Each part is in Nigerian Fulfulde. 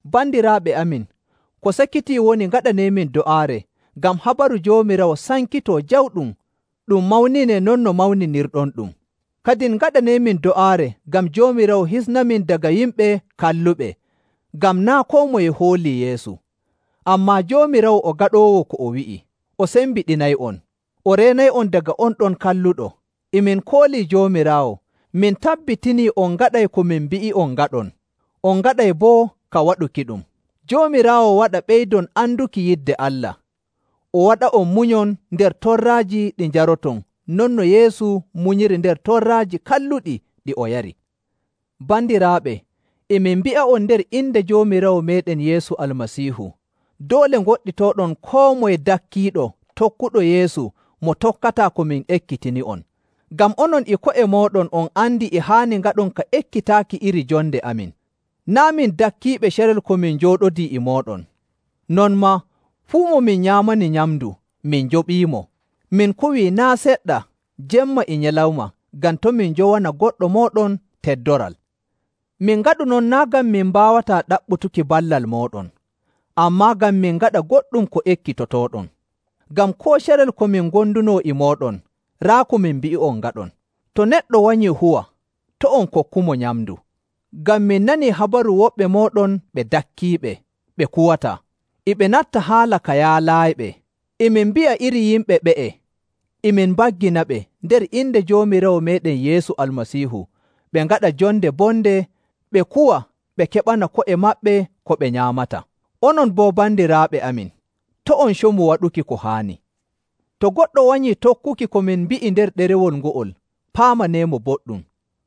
Bandiraaɓe amin, ko sakitii woni ngaɗaneemin do'aare ngam habaru Joomiraawo sankitoo jawɗum ɗum mawninee non no mawninirɗonɗum. Kadin ngaɗaneemin do'aare ngam Joomiraawo hisnamin daga yimɓe kalluɓe, ngam naa' koo moye hoolii Yeesu. Ammaa Joomiraawo o gaɗoowo ko o wi'i, o sembiɗinay'on, o reenay'on daga on ɗon Kalluɗo. E min koolii Joomiraawo, min tabbitinii on ngaɗa ko min mbi'i'on ngaɗon, on ngaɗay boo ka waɗukiɗum. Joomiraawo waɗa ɓeydon anduki yidde Allah o waɗa'on munyon nder torraaji ɗi njaroton non no Yeesu munyiri nder torraaji kalluɗi ɗi o yari. Bandiraaɓe, e min mbi'a'on nder inde Joomiraawo meeɗen Yeesu Almasiihu, doole ngoɗɗitooɗon koo moye dakkiiɗo tokkuɗo Yeesu mo tokkataa ko min ekkitini'on. Ngam onon e ko'e mooɗon on andi e haani ngaɗon ka ekkitaaki iri jonde amin. Naa' min dakkiiɓe carel ko min njooɗodii e mooɗon. Non maa, fuu mo min nyaamani nyamndu min njoɓiimo. Min kuwii naa' seɗɗa jemma e nyalawma ngam to' min njowana goɗɗo mooɗon teddoral. Min ngaɗu non naa' ngam min mbaawataa ɗaɓɓutuki ballal mooɗon, ammaa ngam min ngaɗa goɗɗum ko ekkitotooɗon. Ngam koo carel ko min ngondunoo e mooɗon, raa ko min mbi'i'on ngaɗon, “To neɗɗo wanyii huwa, to' on kokkumo nyamndu.” Ngam min nanii habaru woɓɓe mooɗon ɓe dakkiiɓe, ɓe kuwataa. E ɓe natta haala ka yaalaayiɓe. E min mbi'a iri yimɓe ɓe'e e min mbagginaɓe nder inde Joomiraawo meeɗen Yeesu Almasiihu ɓe ngaɗa jonde bonde ɓe kuwa ɓe keɓana ko'e maɓɓe ko ɓe nyaamata. Onon boo bandiraaɓe amin, to' on comu waɗuki ko haani. To goɗɗo wanyii tokkuki ko min mbi'i nder ɗerewol ngo'ol, paamaneemo boɗɗum.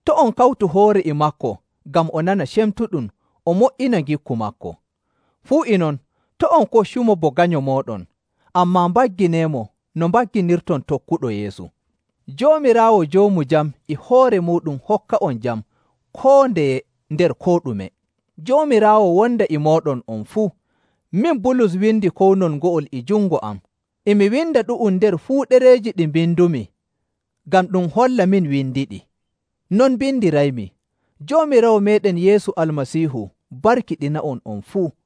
To' on kawtu hoore e maako ngam o nana cemtuɗum o mo''ina ngikku maako. Fuu e non, to' on koccumo bo ganyo mooɗon, ammaa mbaggineemo no mbagginirton tokkuɗo Yeesu. Joomiraawo joomu jam e hoore muuɗum hokka'on jam koo ndeye nder koo ɗume. Joomiraawo wonda e mooɗon on fuu. Min Bulus windi kownol ngo'ol e jungo am. E mi winda ɗu'um nder fuu ɗereeji ɗi mbindumi ngam ɗum holla min windiɗi. Non mbindiraymi. Joomiraawo meeɗen Yeesu Almasiihu barkiɗina'on on fuu.